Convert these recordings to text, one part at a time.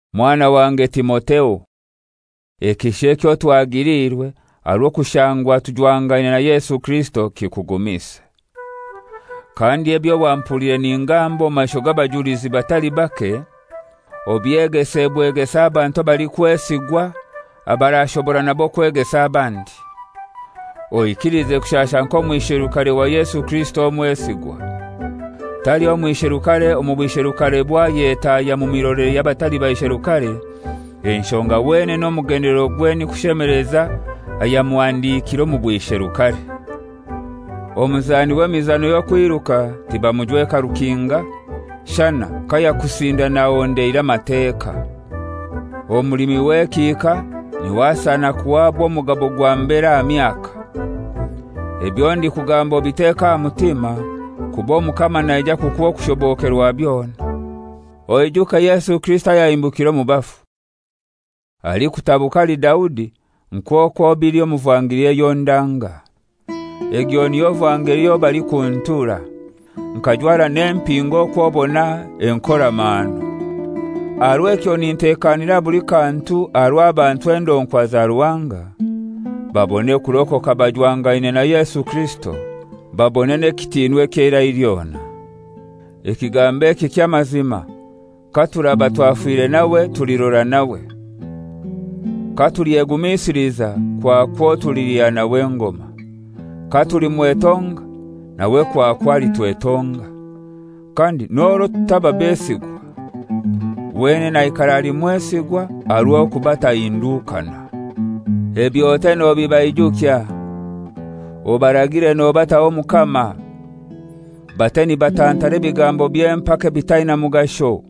Mwana wange Timotheo, ekisha ekyo twigiliirwe aha rw'okushangwa tujwangaine na Yesu Kirisito kikugumise. Kandi ebyo wampuliire ningamba omu maisho g'abajulizi batali bake, obyegese bwegesa abantu abalikwesigwa abarashobora nabo kwegesa abandi. Oikilize kushasha nk'omwisherukare wa Yesu Kirisito omwesigwa. Taliho mwisherukare omu bwisherukarebwe ayetahya omu mirolere y'abatali baisherukare, enshonga wenene omugendelerogwe ni kushemeleza ayamuhandikire omu bwisherukare. Omunzani w'emizano y'okwiruka tibamujweka rukinga, shana kayakusindana ahondeire amateka. Omulimi w'ekihika niwe asana kuhaba omugabo gwa mbere aha myaka. Ebyo ndikugamba obiteke aha mutima, kuba Omukama naija kukuha okushobokerwa byona. Oijuke Yesu Kirisito ayahimbukire omu bafu, alikutabuka ahali Daudi, nk'okwo bili omu vangeli eyo ndanga. Egyo niyo vangeli eyo balikuntura, nkajwara n'empingo okw'obona enkoramahano. Aha rw'ekyo ninteekanira buli kantu aha rw'abantu endonkwa za Ruhanga, babone kurokoka bajwangaine na Yesu Kirisito, babone n'ekitiinwa eky'eirai lyona. Ekigambo eki ky'amazima: «Katuraba twafire nawe, tulirora nawe. Katulyegumisiliza, kwakwo tulilya nawe engoma. Katulimwetonga, nawe kwakwo alitwetonga. Kandi n'orwo tutaba besigwa, wenene aikara ali mwesigwa, aha rw'okuba tahindukana.» Ebyo ote nobibaijukya, obaragire nobataho Omukama, bate nibatantara ebigambo by'empaka ebitaina mugasho,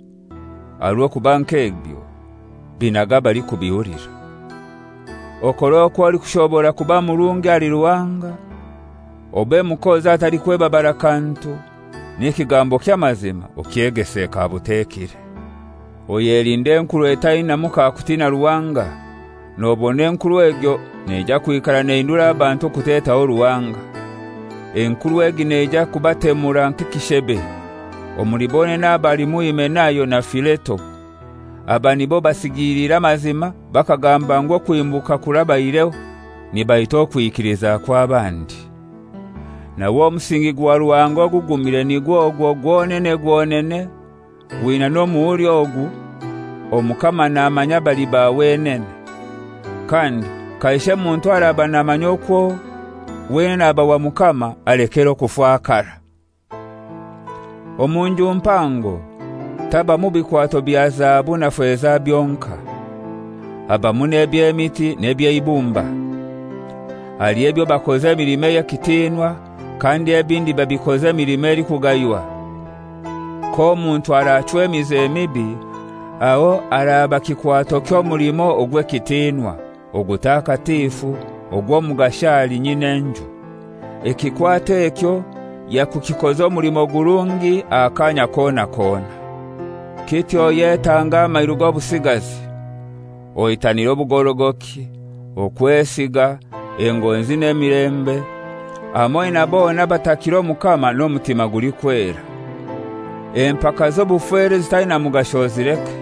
aha orw'okuba nk'ebyo binaga abalikubihulira. Okore okw'olikushobora kuba murungi ahali Ruhanga, obe mukozi atalikwebabara kantu, n'ekigambo ky'amazima okyegese kabutekire. Oyelinde enkuru etainamu kakutiina Ruhanga, nobona enkuru egyo neija kwikara nehindura abantu okutetaho Ruhanga. Enkuru egi neija kubatemura nk'ekishebe. Omuli bonene abo halimu Himenayo na Fileto. Aba nibo basigiliire amazima bakagamba ngu okuhimbuka kurabaireho. Nibaita okwikiliza kw'abandi. Nawe omusingi gwa Ruhanga ogugumire nigwo gwonene gwonene, gwina n'omuhuri ogu: «Omukama namanya abaliba wenene,» kandi, «Kaishe muntu araba namanya okwo wenene aba wa Mukama alekere okufakara.» Omu nju mpango tabamu bikwato bya zahabu na feza byonkai. Habamu n'eby'emiti n'eby'eibumba. Haliho ebyo bakoza emilimo ey'ekitinwa, kandi ebindi babikoza emilimo elikugaywa. K'omuntu arachwa emize mibi, aho araba kikwato ky'omulimo ogw'ekitinwa, ogutakatifu ogw'omugasho ahali nyin'enju, ekikwato ekyo yakukikoza omulimo gurungi Aha kaanya kona kona. Kityo oyetange amairu g'obusigazi, oitanire obugorogoki, okwesiga, engonzi n'emilembe, hamoi na bona abatakira Omukama n'omutima gulikwera. Empaka z'obufera ezitaina mugasho ozileke;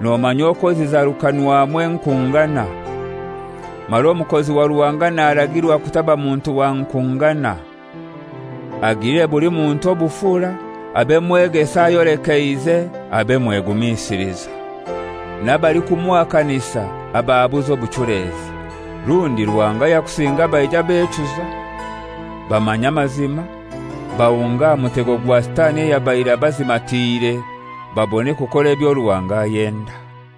nomanya okwo zizarukanwamu enkungana. Mara omukozi wa Ruhanga naragirwa kutaba muntu wa nkungana. Agilire buli muntu obufura, abe mwegesa ayolekeize, abe mwegumisiliza, n'abalikumuhakanisa abahabuze n'obuchulezi. Rundi Ruhanga yakusinga baija bechuza bamanya amazima, bahunga aha mutego gwa Sitani ayabaire abazimatiire, babone kukora ebyo Ruhanga ayenda.